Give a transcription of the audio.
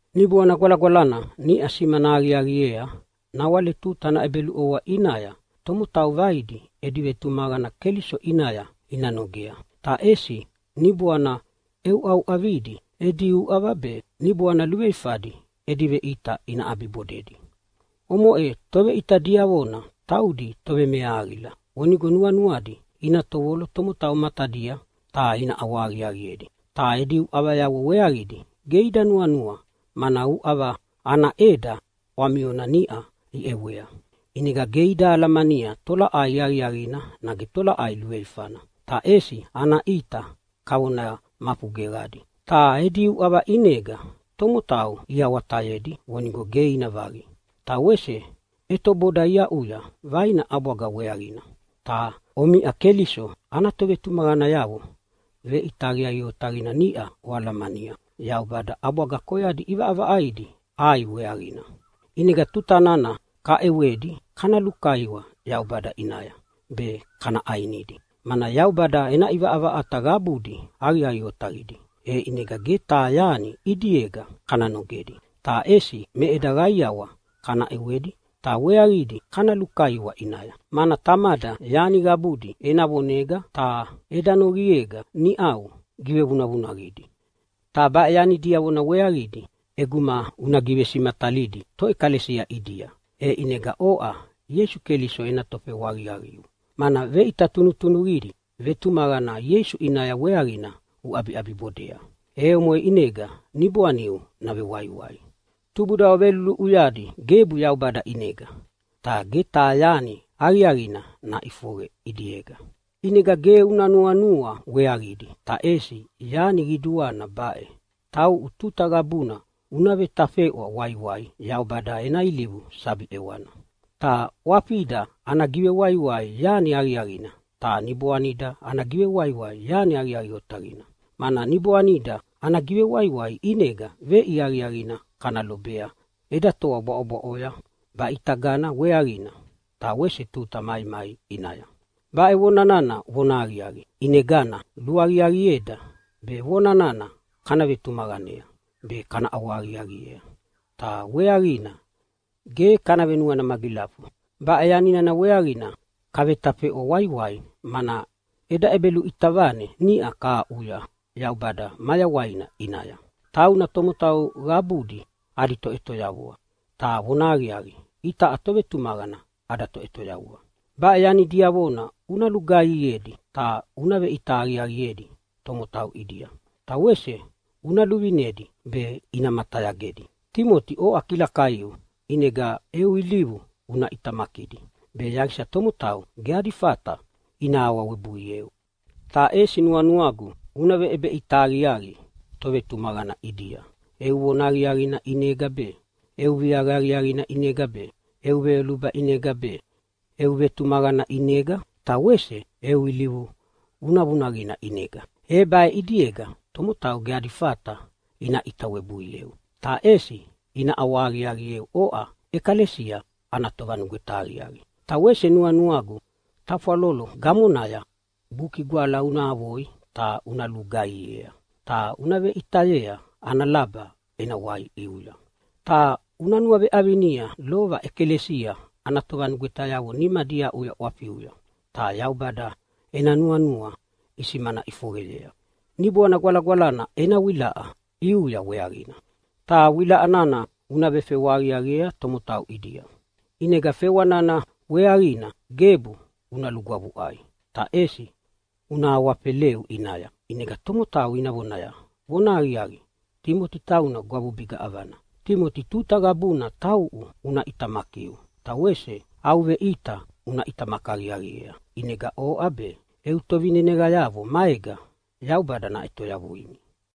Niboana Gwalagwalana niʼa simana aqiaqiea nawale tuta ana ʼebeluʼovoa ʼinaya tomotau vaidi edi vetumaqana Keliso ʼinaya ina nogea, ta ʼesi niboana ʼeuʼauʼavidi edi uʼava be niboana luveifadi edi veʼita ina ʼabibodedi. Omoʼe toveʼita diavona taudi tovemeahaqila vonigo nuanuadi ina tovolo tomotau matadia ta ina ʼawahaqiaqiedi. Ta edi uʼavayavo weaqidi ge ida nuanua, mana uʼava ana ʼeda ʼwamiona niʼa iʼewea. ʼInega ge ida alamania tolaʼai aqiaqina nage tolaʼai luveifana, ta ʼesi ana ʼita kavona mafu geqadi. Ta edi uʼava ʼinega tomotau iawatayedi vonigo ge ina vaqi, ta wese ʼetoboda iaʼuya vaina ʼabwaga weaqina. Ta omiʼa Keliso ana tovetumaqanayavo veʼita aqiaqi otaqina niʼa oalamania Yaubada ʼabwaga koyadi ʼivaʼavaʼaidi ʼai weaqina. ʼInega tuta nana kaʼewedi kana lukaiwa Yaubada ʼinaya be kana ʼainidi, mana Yaubada ena ʼivaʼavaʼata qabudi aqiaqi otaqidi, e ʼinega ge taha yani ʼidiega kana nogedi. Ta ʼesi me eda qaiawa kana ʼewedi, ta weaqidi kana lukaiwa ʼinaya, mana Tamada yani qabudi ena vonega ta eda noqiega niʼau givevunavunaqidi. Ta baʼe yani diavona weaqidi ʼeguma una givesimatalidi toʼekalesia ʼidia, e ʼinega oʼa Ieisu Keliso ena tofewa aqiaqiu, mana veʼita tunutunuqidi vetumaqana Ieisu ʼinaya weaqina uʼabiʼabibodea, e omoʼe ʼinega niboaniu navewaiwai. Tubudavo veluluʼuyadi gebu Yaubada ʼinega, ta ge taha yani aqiaqina naʼifoqe ʼidiega. ʼInegana ge una nuanua weaqidi, ta ʼesi yani qiduana baʼe: Tauʼu tuta qabuna una vetafeʼwa waiwai Yaubada ena ilivu sabi ʼewana. Ta ʼwafida ana givewaiwai yani aqiaqina ta niboanida ana givewaiwai yani aqiaqi otaqina, mana niboanida ana givewaiwai ʼinega veʼia aqiaqina kana lobea eda toa bwaʼobwaʼoya baʼitagana weaqina, ta wese tuta maimai ʼinaya. Baʼe vona nana vonahaqiaqi, ʼinegana luaqiaqieda be vona nana kana vetumaqanea be kana ʼawahaqiaqiea ta weaqina ge kana venuana magilafu. Baʼe yani nana weaqina kavetafeʼwa waiwai, mana eda ʼebeluʼita vane niʼa kahaʼuya Yaubada mayawaina ʼinaya. Tauna tomotau qabudi adi Toʼetoyavua, ta vonahaqiaqi itaʼa tovetumaqana ada Toʼetoyavua. Baʼe yani diavona una lugaihiedi ta una veʼita aqiaqiedi tomotau ʼidia, ta wese una luvinedi be ina matayagedi. Timoti, oʼa kilakaiu ʼinega eu ilivu una ʼitamakidi be yaqisa tomotau ge adi fata ina awawebuieu. Ta ʼesi nuanuagu una veʼebeʼita aqiaqi tovetumaqana ʼidia eu vona aqiaqina ʼinega be, eu viaqa aqiaqina ʼinega be, eu veyoluba ʼinega be, eu vetumaqana ʼinega, ta wese eu ilivu vunavunaqina ʼinega. E baʼe ʼidiega tomotau ge adi fata ina ʼita webuieu, ta ʼesi ina ʼawahaqiaqieu oʼa ʼekalesia ana tovanugweta aqiaqi. Ta wese nuanuagu tafwalolo gamonaya Buki Gwala una avoya ta una lugaihiea ta una veveʼitayea ana laba ena wai ʼiuya. Ta una nuaveʼavinia lova ʼekalesia ana tovanugwetayavo nimadi iaʼuya ʼwafiuya ta Yaubada ena nuanua isimana ʼifoqeyea Niboana Gwalagwalana ena wilaʼa ʼiuya weaqina. Ta wilaʼa nana una vefewa aqiaqiea tomotau ʼidia. ʼInega fewa nana weaqina gebu una lugwavuʼai ta ʼesi una awafeleu ʼinaya, ʼinega tomotau ina vonaya, “Vonahaqiaqi, Timoti tauna gwavubiga ʼavana!” Timoti, tuta qabuna tauʼu una ʼitamakiu ta wese au veʼita una ʼitamaki aqiaqiea, ʼinega oʼa be eu tovineneqayavo maega Yaubada naʼetoyavuimi.